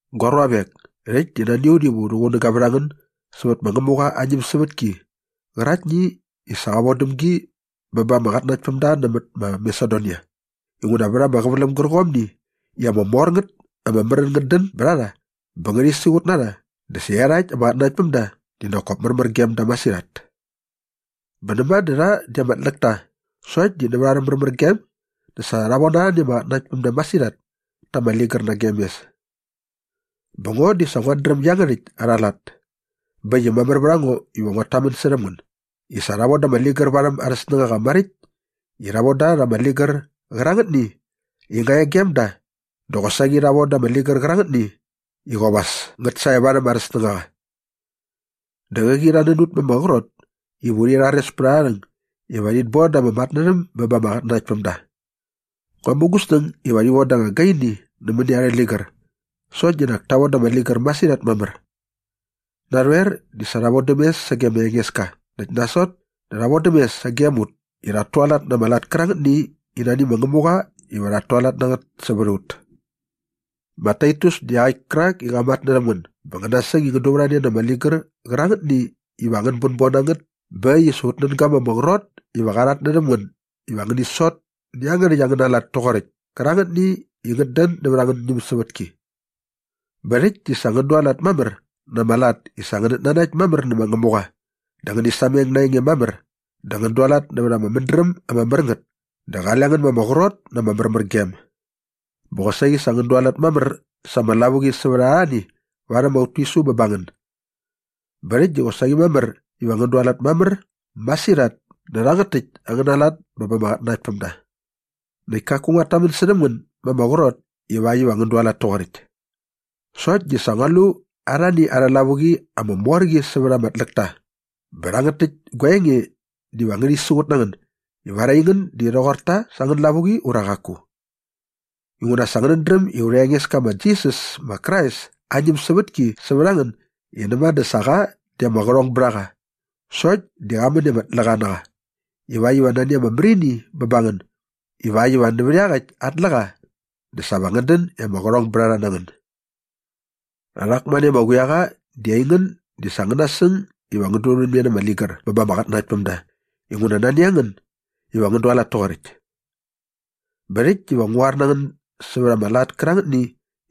Gua ruavek, rhäkt di nani a ut iva u rhuqunäga vät a ngän sävät ma Ngämuqa aa ñämsävätki qäraktni i sa qa von däm gi bä ba ama qatnanaktpämda nämät ma Masedonia inguna vät ama qäväläm gärqomni i ama mor ngät ama märän ngät dän bät a rha bä ngärhi siqut na rha dä sa iarhakt ama qatnanaktpämda di nak kop märmär gem da masirhat. Bä näma dä rha di ama tläk ta sokt di nävät arhä märmärgem dä sa rha von arhani ama qatnanaktpämda masirhat ta ama ligär nagem mes. Bä ngo di sa nguat dräm iangärhäkt arha lat bä äkt i mamär vät a ngo iva nguat tamän särhäm ngän i sa rha von da ama ligär varhäm arhä snängaqa maräkt i rha von da rha ama ligär qärangätni i nga e gem da dä qosaqi rha von da rha angätni qärangätni i qop as ngät sae varhäm arhä snängaqa. Dä qäqi rha nän ut ma ama qrot iva urhi rhares pät arha rhäng iva rhit bon da ama matnärhäm bä ba ama qatnanaktpämda. Ngua mu gu snäng iva rhi von da anga gaini nämäni arhä ligär sokt di nak ta von da ama ligär masirhat mamär. Narhoer di sa rha vodäm mes sage ma Engeska näkt nasot dä rha vodäm mes sagem ut i rhat tualat na ama lat kärangätni i nani ma Ngämuqa iva rhat tualat na ngät sävät a ut. Ma Taitus di iaqäkt kärakni i qa matnärhäm ngän bä ngän nasäng i ngän durhämne na ama ligär qärangätni iva angän bänbon na ngät bä äkt i sa ut nän ga ma ama qrot iva qa rhatnärhäm ngän iva ngäni sot nä iangärhäkt angäna lat toqoräkt kärangätni i ngät dän nävät angän ñämsävätki. Bä rhäkt di sa ngän dualat mamär na ama lat i sa ngänät nanakt mamär nä ma Ngämuqa dä ngäni sameng na aa enge mamär dä ngän dualat nävät ama mädräm ama mär ngät dä qale ngän ma ama qrot na ama märmärgem. Bä qosaqi sa ngän dualat mamär sa ama lavuqi sävät arhani varhäm aut tisu bä ba ngän. Bä rhäkt di qosaqi mamär iva ngän dualat mamär masirhat nä rhangät täkt angäna lat bä ba ama qatnanaktpämda. Näkt kaku nguat tamän särhäm ngän ma ama qrot ivakt iva ngän dualat toqoräkt. Sokt di sa ngua lu arhani arhä lavuqi ama mor qi sävät ama tläkta bä rhangät täkt gua enge diva ngärhi siqut na ngän ivar aingän di rhoqor ta sä angän lavuqi ura qaku. Inguna sa ngänät dräm i aurha Engeska ma Jisas ma Krais aa ñämsävätki sävät a ngän i näma dä sa qa di ama qärhong bät a qa sokt di qa män i ama tläqa na qa ivakt iva nani ama märini bä ba ngän ivakt iva nävät iaqäkt aa tläqa dä sa va ngän dän i ama qärhongbärharha na ngän. Rhak mane ama quiaqa di aingän di sa ngän nasäng iva ngän durhämne na ama ligär bä ba ama qatnanaktpämda inguna nani a ngän iva ngän dualat toqoräkt. Bä rhäkt diva ngu qoar na ngän sävät ama lat kärangätni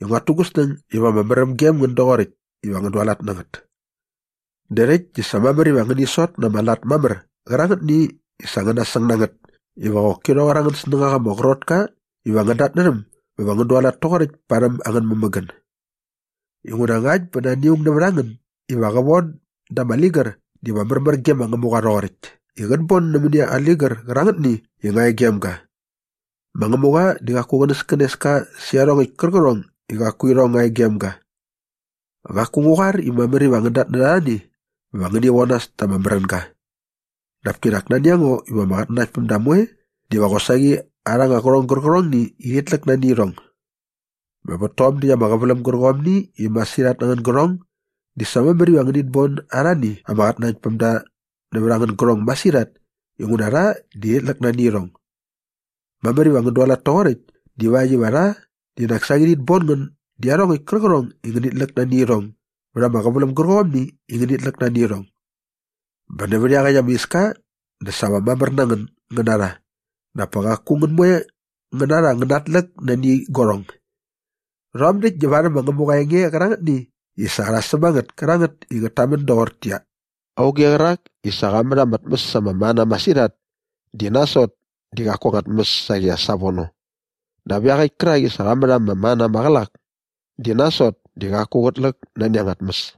i nguat tu gu snäng iva ama märäm gem ngän doqoräkt iva ngän dualat na ngät. Dä rhäkt di sa mamär iva ngäni sot na ama lat mamär qärangätni i sa ngän nasäng na ngät iva qoki rhoqor angän snängaqa ama qrot ka iva ngän datnärhäm bä va ngän dualat toqoräkt parhäm angän mämägän. Inguna ngakt bä nani aung nävät a ngän iva qä von da ama ligär diva märmär ge ma Ngämuqa rhoqoräkt i qät bon nämäni ama ligär qärangätni i nga e gem ga. Ma Ngämuqa di qaku qänäskänes ka sä iarhongäkt kärqärhong i qaku irhong nga e gem ga. Qaku ngu qoar i mamär iva ngän datnärha arhani bä va ngäni von nas ta ama märänga. Dap kinak nani a ngo iva ama qatnanaktpämda moe diva qosaqi arha anga qärhong gärqärhongni i rhit läk nani irhong. Bä vät tom däkt ama qäväläm gärqomni i masirhat na angän gärhong di sa mamär iva ngänit bon arhani ama qatnanaktpämda nävät angän gärhong masirhat inguna rha di rhit läk nani irhong. Mamär iva ngän dualat toqoräkt divakt iva rha di nak saqi rhit bon ngän dä iarhongäkt kärqärhong i ngänit läk nani irhong bät ama qäväläm gärqomni iva ngänit läk nani irhong. Bä nävät iaqäkt ama iska dä sa va mamär na ngän ngän na rha dap pa qaku ngän moe ngän na rha va ngän natläk nani guarhong. Rhom däkt di varhäm ma Ngämuqa aa enge qärangätni i sa rha säm a ngät kärangät i ngät tamän doqortäqyia, “Auge qärak i sa qa mät ama tmäs ama mana masirhat di nasot di qaku anga tmäs saqi as savono dap iaqäkt kärak i sa qa mät ama mana maqälak di nasot di qaku qät läk nani anga tmäs.”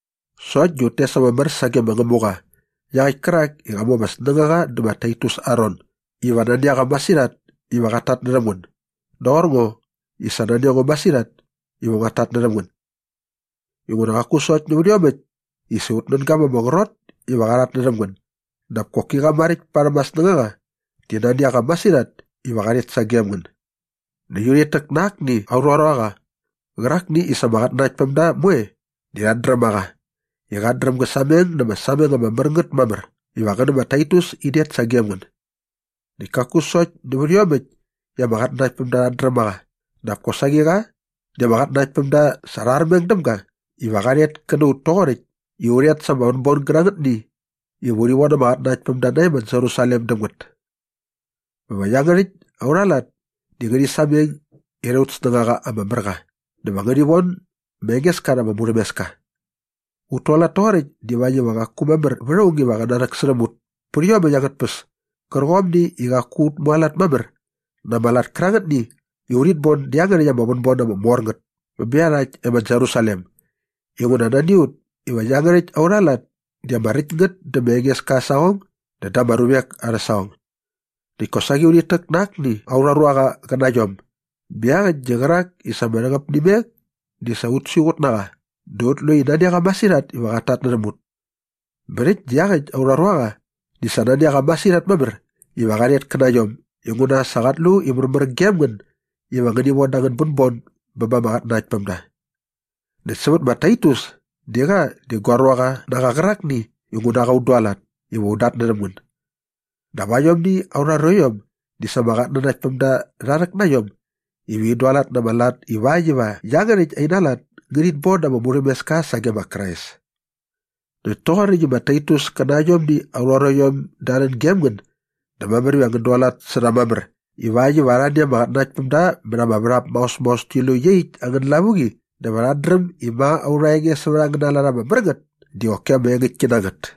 Sokt di ut tes ama mär sage ma Ngämuqa iaqäkt kärak i qa mu ama snängaqa dä ma Taitus aa ron iva nani a qa masirhat iva qat tatnärhäm ngän doqor ngo i sa nani a ngo masirhat iva nguat tatnärhäm ngän. Inguna qaku sokt nävät iomäkt i sa ut nän ga ma ama qrot iva qa rhatnärhäm ngän dap koki qa maräkt parhäm aa snängaqa di nani a qa masirhat iva qa rhet sagem ngän. Näkt urhit täk na akni aurha ruaqa qärakni i sa ama qatnanaktpämda moe di rhat dräm a qa i qat dräm gä sameng na ama sameng ama mär ngät mamär iva qä nä ma Taitus in det sagem ngän. Näkt kaku sokt nävät iomäkt i ama qatnanaktpämda rhat dräm a qa dap kosaqi qa di ama qatnanaktpämda sa rha armeng däm ga iva qa rhet kä na ut toqoräkt i u rhet sa ama vänbon gärangätni iva urhi von ama qatnanaktpämda nae ma Jerusalem däm ngät. Bä va iangärhäkt aurha lat di ngärhi sameng irha aut snängaqa ama mär qa dä va ngärhi von ma Engeska rha ama murhämeska. Ut tualat toqoräkt divakt iva qaku mamär vät aung iva qä narhäksärhäm ut pät iomäkt angät tpäs kärqomni i qaku ut mualat mamär na ama lat kärangätni i urhit bon dä iangärhäkt ama vänbon ama mor ngät bä bä iarhakt e ma Jerusalem inguna nani a ut iva iangärhäkt aurha lat di ama räkt ngät dä ma Engeska aa saqong dä da ama ruvek arhä saqong. Näkt kosaqi urhit täk na akni aurha ruaqa qä na iom bä iaqäkt di qärak i sa ma ama rhäqäp nä imek di sa ut siqut na qa dä ut lu i nani a qa masirhat iva qat tatnärhäm ut. Bä rhäkt di iaqäkt aurha ruaqa di sa nani a qa masirhat mamär iva qa rhet kä na iom inguna sa qat lu i märmär gem ngän iva ngäni von da angän bänbon bä ba ama qatnanaktpämda. Näkt sävät ma Taitus di qa di gua ruaqa na qa qärakni i ngu na qa un dualat iva un datnärhäm ngän. Dap aiomni aurha ruaiom di sa ama qatnanaktpämda rha rhäk na iom iva in dualat na ama lat ivakt iva iangärhäkt ina lat ngärhit bon da ama murhämeska sage ma Krais. Näkt toqoräkt i ma Taitus kä na aiomni aurha ruaiom da rhän gem ngän dä mamär iva ngän dualat sä rha mamär ivakt iva arhani ama qatnanaktpämda mät ama värhap maos maos ti lu iaqyäkt angän lavuqi dä va rhat dräm i ma aurha enge sävät angäna lat ama mär ngät di qoki ama engäktki na ngät.